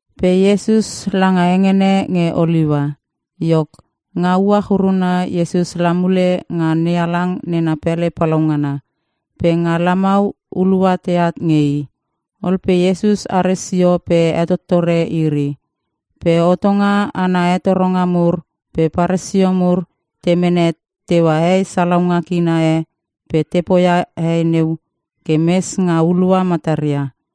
Pe Iesus langa hengene nge Oliua. Iok, nga uach uruna Iesus la mule nga NeHalang nena pele palaungana. Pe nga lamau hulua teat nge i. Ol pe Iesus are sio pe hetottore iri. Pe hotonga ana hetoronga mur pe Paresio mur te mene teua hei salaunga kina e pe te poia hei neu ke mes nga hulua mataria.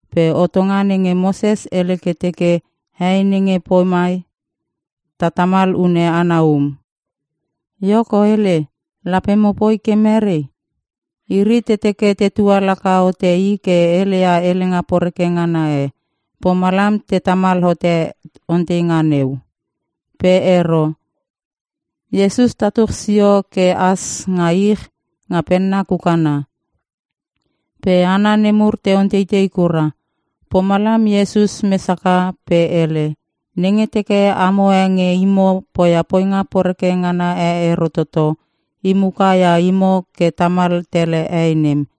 Pe hotonga nenge Moses hele ke teke hei nenge pomai ta tamal hune ana um. Iok o hele, lape mopoi ke mere?” Iri te teke tetua laka hote i ke heleia helenga poreke ngana e. Pomalam te tamal hote onteinga neu. Pe ero. Iesus tatuch sio ke has nga ich nga penna kukanna. Pe hana nemur te onteitei kura. Pomalam Iesus mes haka pe hele, “Nenge teke amo e nge imo poia poinga poreke ngana e ero toto, i muka ia imo ke tamal tele hei nem.”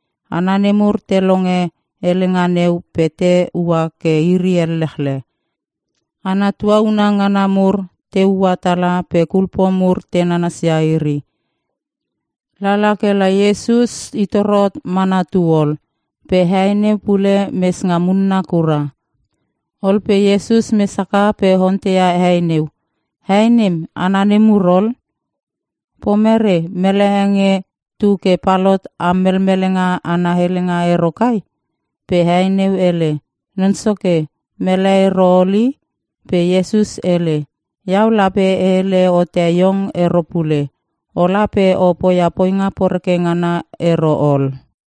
Hana nemur te longe helenga neu pe te ua ke iri ellechle. Hana tuauna ngana mur te ua tala pe kulpo mur te nanasia iri. Lala kela Iesus i toro mana tu ol pe hei neu pule mes nga munna kura. Ol pe Iesus mes haka pe onteia hei neu, “Hei nem, hana nemur ol? Pomere, mele e nge tu ke palot am melmelenga ana helenga ero kai?” Pe hei neu hele, “Non Soke, mele ero ol i.” Pe Iesus hele, “Iau lape e hele hote iong ero pule. Ola pe o poia poinga poreke ngana ero ol.”]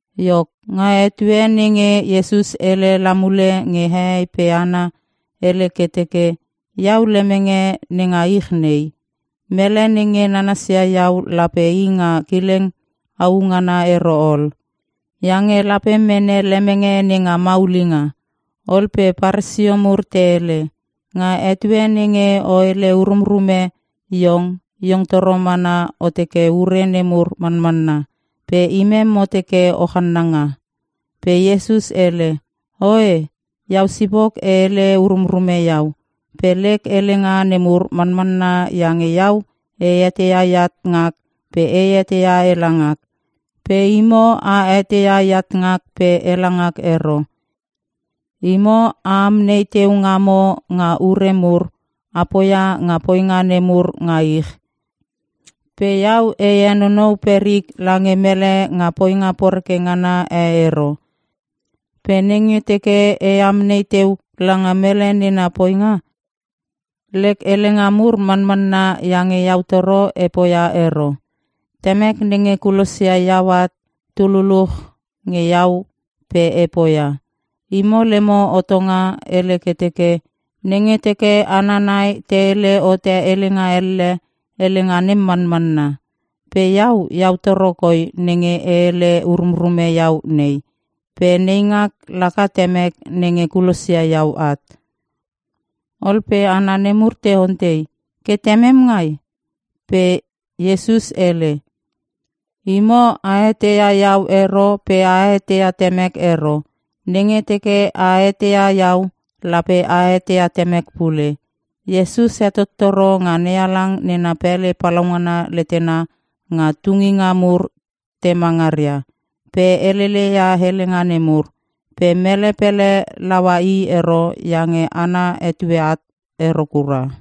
Iok, nga etue nenge Iesus hele la mule nge hehei pe hana, hele ke teke, “Iau lemenge nenga ich nei. Mele nenge nanasia iau lape i nga kileng au ngana ero ol. Iange lape mene lemenge nenga maulinga.” Ol pe Paresio mur te hele, “Nga etue nenge o hele urumrume iong, iong toro mana o teke ure nemur manmanna. Pe imem mo teke o channanga.” Pe Iesus hele, “Oe, iau sipok e hele urumrume iau. Pe lek helenga nemur manmanna iange iau e eteia eat ngak pe e eteia ela ngak. Pe imo a eteia eat ngak pe ela ngak ero. Imo a amnei teu ngamo nga ure mur, a poia nga poinga nemur nga ich. Pe iau e henonou perik lange mele nga poinga poreke ngana e ero. Pe nenge teke e amnei teu langa mele nena poinga, lek helenga mur manmanna iange iau toro e poia ero. Temek nenge kulosia iau at tu luluch nge iau pe e poia. Imo lemo hotonga hele ke teke, ‘Nenge teke hana nai te hele hote helenga elle, helenga nem manmanna.’ Pe iau, iau toro koi nenge e hele urumrume iau nei. Pe neingak laka Temek nenge kulosia iau at.” Ol pe hana nemur te ontei, “Ke Temem ngai?” Pe Iesus hele, “Imo a eteia iau ero pe a eteia Temek ero. Nenge teke a eteia iau, lape a eteia Temek pule.” Iesus hetottoro nga NeHalang nena pele palaungana letena nga tunginga mur tema ngaria, pe helele ia helenga nemur. Pe mele pele laua i ero iange ana etue at ero kura.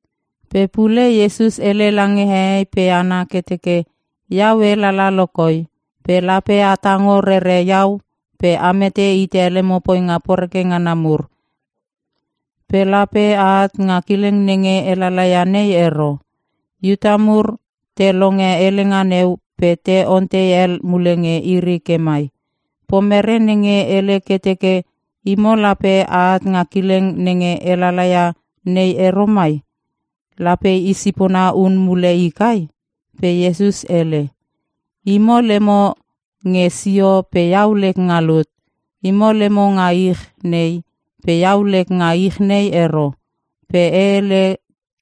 Pe pule Iesus hele lange hehei pe hana ke teke, “Iau e lala lo koi. Pe lape a tongo rere iau pe a mete hite lemo poinga poreke ngana mur. Pe lape a at nga kileng nenge e lala ia nei ero.” Iuta mur te longe helenga neu pe te ontei hel mule nge iri ke mai, “Pomerei nenge hele ke teke, ‘Imo lape at nga kileng nenge e lala ia nei ero mai?’ Lape i sipona hun mule i kai?” Pe Iesus hele, “Imo lemo nge sio pe iau lek nga lut. Imo lemo nga ich nei pe iau lek nga ich nei ero. Pe e hele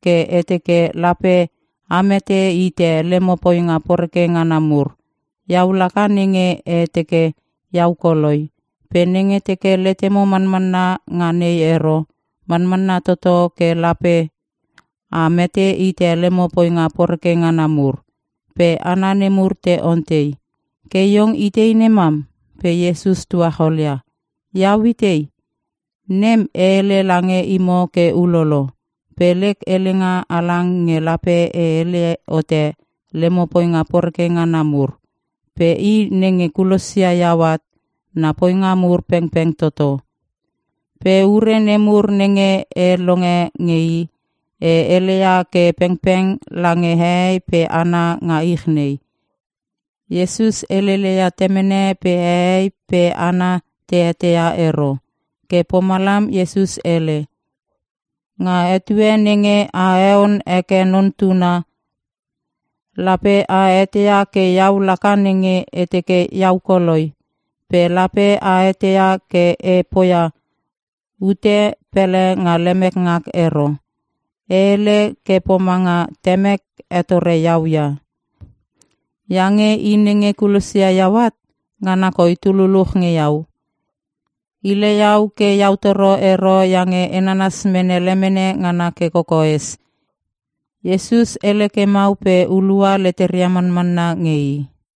ke e teke lape a mete hite lemo poinga poreke ngana mur. Iau laka nenge e teke iau koloi. Pe nenge teke letemo manmanna nga nei ero, manmanna toto ke lape a mete hite lemo poinga poreke ngana mur.” Pe hana nemur te ontei, “Ke iong itei nemam?” Pe Iesus tuacholia, “Iau itei? Nem e heleia lange imo ke ulolo. Pe lek helenga halang nge lape e hele hote lemo poinga poreke ngana mur. Pe i nenge kulosia iau at na poinga mur pengpeng toto. Pe ure nemur nenge e longe nge i, e heleia ke pengpeng lange hehei pe hana nga ich nei.” Iesus helele ia Temene pe hehei pe hana te eteia ero. Ke pomalam Iesus hele, “Nga etue nenge a heon heke Non Tuna, lape a eteia ke iau laka nenge e teke iau koloi. Pe lape a eteia ke e poia ute pele nga lemek ngak ero. E hele ke pomanga Temek hetoro iau ia. Iange i nenge kulosia iau at, ngana koi tu luluch nge iau; Hile iau ke iau toro ero iange e nanas mene lemene ngana ke kokoes.” Iesus hele ke mau pe hulua leteria manmanna nge i.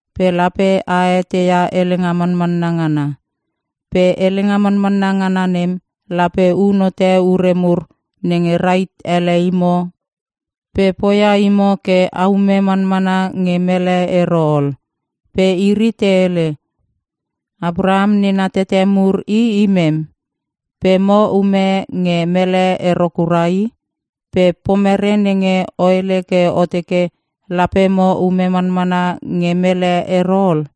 Pe lape a eteia helenga manmanna ngana. Pe helenga manmanna ngana nem lape un hote ure mur nenge rahit ele imo pe poia imo ke a ume manmanna nge mele ero ol.” Pe iri te hele, “Apraham nena tete mur i imem. Pe mo ume nge mele ero kura i. Pe pomere nenge o hele ke o teke lape mo ume manmanna nge mele ero ol?”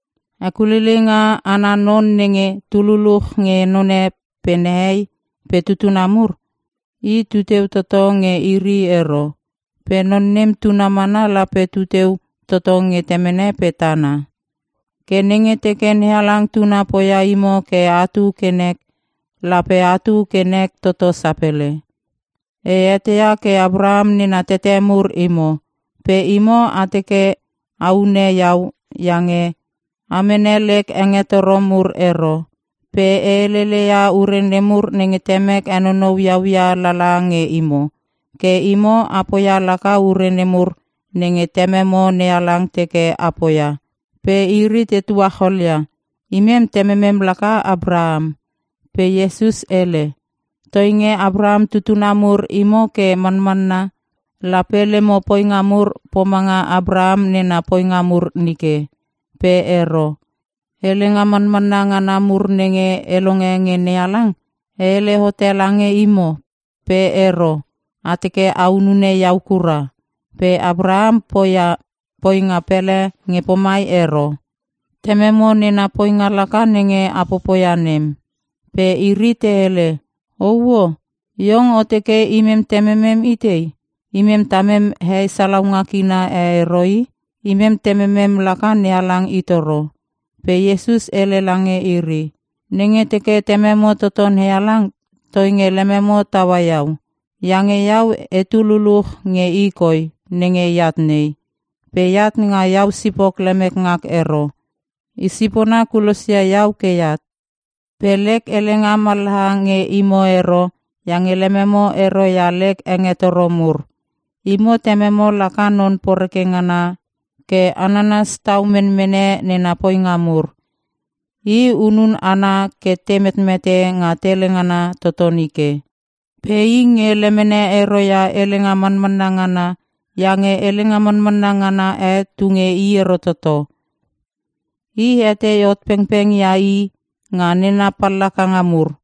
Hekuleileinga ana non nenge tu luluch nge none pe nehei pe tutuna mur, i tuteu toto nge iri ero. Pe non nem tuna mana lape tu teu toto nge temene pe tana. Ke nenge teke NeHalang Tuna poia imo ke atu ke nek, lape atu ke nek toto sapele. E eteia ke Apraham nena tete mur imo. Pe imo a teke a hune iau iange a mene lek hengetoro mur ero. Pe e helele ia ure nemur nenge Temek henonou iau ia lala nge imo. Ke imo a poia laka ure nemur nenge Tememo NeHalang teke a poia.” Pe iri te tuacholia, “Imem tememem laka Apraham.” Pe Iesus hele, “Toinge Apraham tutuna mur imo ke manmanna, lape lemo poinga mur pomanga Apraham nena poinga mur nike. Pe ero. Helenga manmanna ngana mur nenge e longe nge NeHalang e hele hote lange imo. Pe ero, a teke a hunune iau kura. Pe Apraham poia poinga pele nge pomai ero. Tememo nena poinga laka nenge a popoia nem.” Pe iri te hele, “Ouo! Iong o teke imem tememem itei? Imem tamem hei salaunga kina e ero i! Imem Tememem laka NeHalang i toro.” Pe Iesus hele lange iri, “Nenge teke Tememo toto NeHalang toinge lememo taua iau. Iange iau etu luluch nge i koi nenge eat nei. Pe eat nga iau sipok lemek ngak ero; i sipona kulosia iau ke eat. Pe lek helenga mallaha nge imo ero iange lememo ero ia lek hengetoro mur. Imo tememo laka non poreke ngana ke a nanas tau menmene nena poinga mur. I hunun hana ke te metmete nga tele ngana toto nike. Pe i nge lemene ero ia helenga manmanna ngana iange helenga manmanna ngana e tu nge i ero toto. I hetei hot pengpeng ia i nga nena pallakanga mur.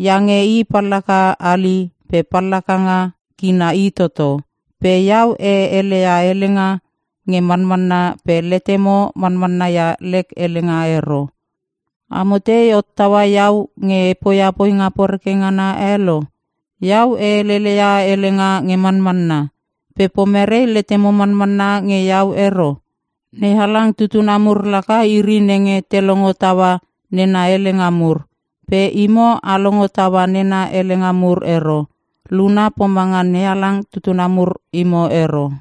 Iange i pallaka hali pe pallakanga kina i toto. Pe iau e heleia helenga nge manmanna pe letemo manmanna ia lek helenga ero. Amo tei hottaua iau nge e poia poinga poreke ngana e lo? Iau e helele ia helenga nge manmanna. Pe pomerei letemo manmanna nge iau ero? NeHalang tutuna mur laka iri nenge te longo taua nena helenga mur. Pe imo a longo taua nena helenga mur ero. Luna pomanga NeHalang tutuna mur imo ero.”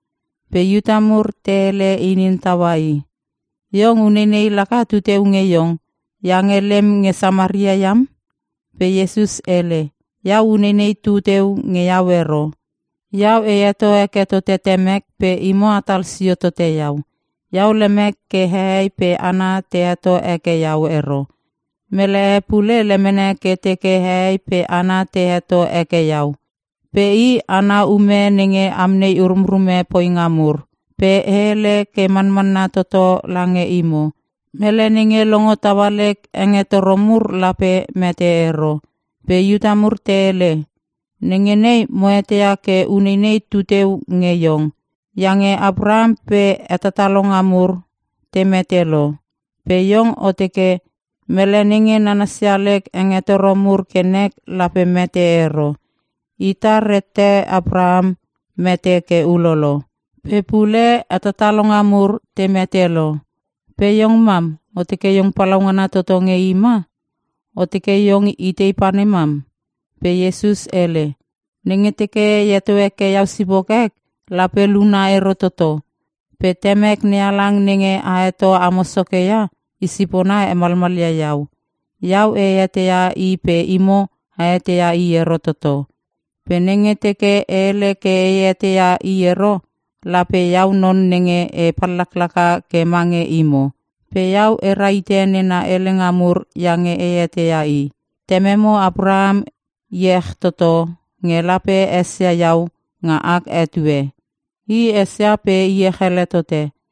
Pe Iuta mur te hele inin taua i, “Iong uneinei laka tuteu nge iong iange lem nge Samaria iam.” Pe Iesus hele, “Iau uneinei tu teu nge iau ero. Iau e heto heke tote Temek pe imo atal sio tote iau. Iau lemek ke hehei pe hana te heto heke iau ero. Mele e pule lemene ke teke hehei pe hana te heto heke iau. Pe i, ana ume nenge amnei urumrume poinga mur. Pe e hele ke manmanna toto lange imo. Mele nenge longo taua lek hengetoro mur lape mete ero.” Pe Iuta mur te hele, “Nenge nei mo eteia ke uneinei tu teu nge Iong! Iange Apraham pe hetatalonga mur te mete lo. Pe iong o teke, ‘Mele nenge nanasia lek hengetoro mur ke nek lape mete ero.’ Ita rette Apraham mete ke ulolo. Pe pule hetatalonga mur te mete lo. Pe iong mam! O teke iong palaungana toto nge i ma? O teke iong itei panem mam?” Pe Iesus hele, “Nenge teke e heto heke iau sipok ek, lape luna ero toto. Pe Temek NeHalang nenge a heto amo Soke ia, i sipona hemalmalia iau. Iau e eteia i pe imo a eteia i ero toto. Pe nenge teke e hele ke e eteia i ero, lape iau non nenge e pallaklaka ke mange imo. Pe iau e rahite nena helenga mur iange e eteia i. Tememo Apraham iech toto nge lape esia iau nga ak etue. I esia pe iech ele tote.”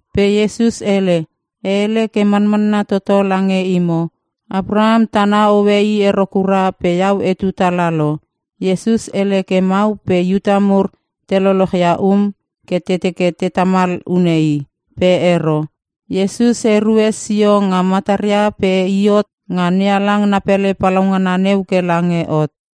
Pe Iesus hele, “E hele ke manmanna toto lange imo. Apraham tana hoe i ero kura pe iau etu tala lo.” Iesus hele ke mau pe Iuta mur te lolochia um ke te teke te tamal hune i. Pe ero. Iesus erue sio nga mataria pe i hot nga NeHalang na pele palaungana neu ke lange hot.